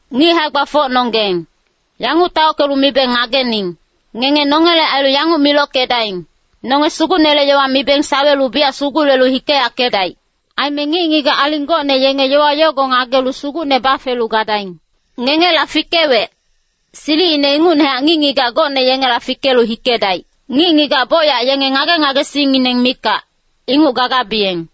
Ngic hae-gbafocnonggeng, yanguc taockelu mibeng ngagening. Ngenge nongele ailu yanguc milockedaing, nonge Sugucnele yowa mibeng sawelu biyac sugulelu hikeyackedaic. Aime ngic-ngigac aling gocne yenge yowa yogo ngagelu Sugucne bafelu gadaing. Ngengela fikewec, silicine ingucnehac ngic-ngigac gocne yengela fikelu hikedaic. Ngic-ngigac bocyac yenge ngage-ngagesingngineng mikac, inguc gagabiyeng.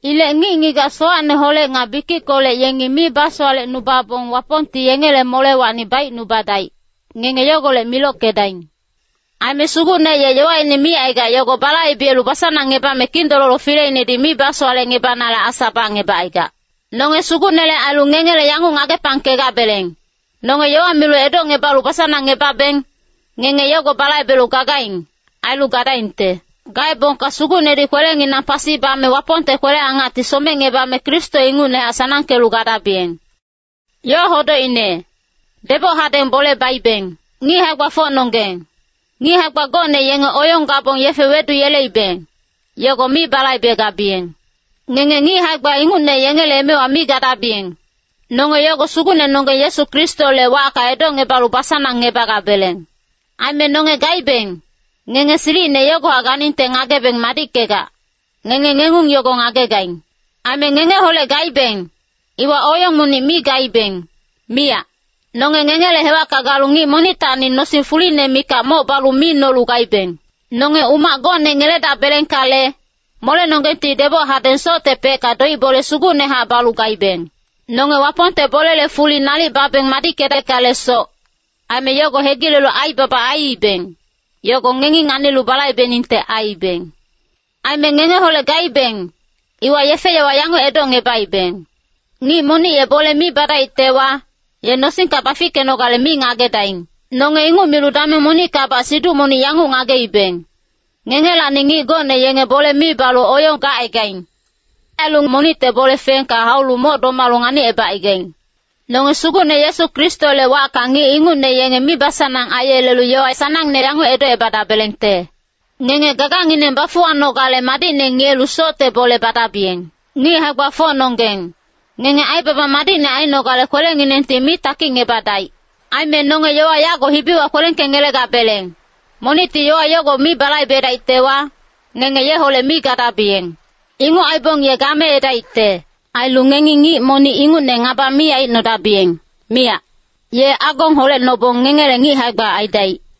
Ilec ngic-ngigac sowacneholec nga bikickolec yengi mi basowalecnubabong Wapongti yengele molewacni baicnubadaic, ngenge yogolec milockedaing. Aime Sugucne ye yowaine micaigac yogo balaibelu basanangngebame Kindololo fileinedi mi basowalecngebanale asa bacngebacaigac. Nonge Sugucnele ailu ngengele yanguc ngagepangkegabeleng. Nonge yowa milu edocngebalu basanangngebabeng, ngenge yogo balaibelu gagaing, ailu gadaingte. Gaebongka Sugucnedi kwelenginang pasi bame Wapongte kwele-angacti somecngebame Kristo ingucnehac sanangkelu gadabiyeng. Ngic hae-gbafocnonggeng, ngic hae-gba gocne yenge oyong gabong yefe weduyeleibeng, yogo mi balaibegabiyeng. Ngenge ngic hae-gba ingucne yengele emewa mi gadabiyeng. Nonge yogo Sugucnenonggeng Yesu Kristole wacka edocngebalu basanangngebagabeleng. Aime nonge gaibeng, ngenge silicine yogohac ganingte ngagebeng madickegac, ngenge ngengung yogo ngagegaing. Aime ngengeholec gaibeng, iwa oyong monic mi gaibeng, miyac. Nonge ngengele hewacka galu ngic monictacni nosing fuline mikac moc balu mi nolu gaibeng. Nonge umac gocne ngeledabelengkale, molenonggengti deboc hadeng soctepecka doic-bole sugucnehac balu gaibeng. Nonge Wapongte bolele fuli nalic babeng madickedeckalesoc, aime yogo hegilelu aibaba aiibeng, yogo ngengi nganilu balaibeningte aiibeng. Aime ngengeholec gaibeng, iwa yefe-yowa yanguc edocngebaibeng, “Ngic monic ye bole mi badaictewa, ye nosingka bafickenogale mi ngagedaing.” Nonge inguc milu dameng monickabac siduc monic yanguc ngageibeng, ngengelacni ngic gocne yenge bole mi balu oyong gacaigaing. Ailu monicte bole fengka haulu moc domalu nganicebacaigaing. Nonge Sugucne Yesu Kristole wacka ngic ingucne yenge mibasanang aiyelelu yowa sanangne yanguc edocebadabelengte, “Ngenge gagangineng bafuwanogale madicne ngiyelu socte bole badabiyeng.” Ngic hae-gbafocnonggeng, ngenge aibaba madicne ainogale kwelenginengti mi takicngebadaic. Aime nonge yowa yago hibiwa kwelengkengelegabeleng, monicti yowa yogo mi balaibedaictewa, ngenge yeholec mi gadabiyeng. Inguc aibong ye gameedaicte. Ailu ngengi ngic monic ingucne ngaba mi aicnodabiyeng, miyac. Ye agong holecnobong ngengele ngic hae-gba aidaic.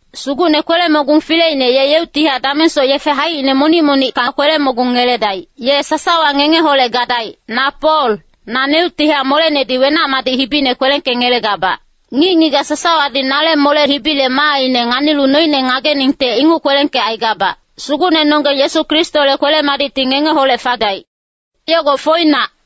Sugucne kwele-mogung fileine ye yeuctihac damengsoc yefe haicine monic-monicka kwele-mogung ngeledaic. Ye sasawa ngengeholec gadaic. Na Pol, naneuctihac molenedi wenac-madic hibine kwelengkengelegabac. Ngic-ngigac sasawadi nale mole hibile maaine nganilu noine ngageningte inguc kwelengkecaigabac. Sugucnenonggeng Yesu Kristole kwele-madicti ngengeholec fadaic. Yogo foinac.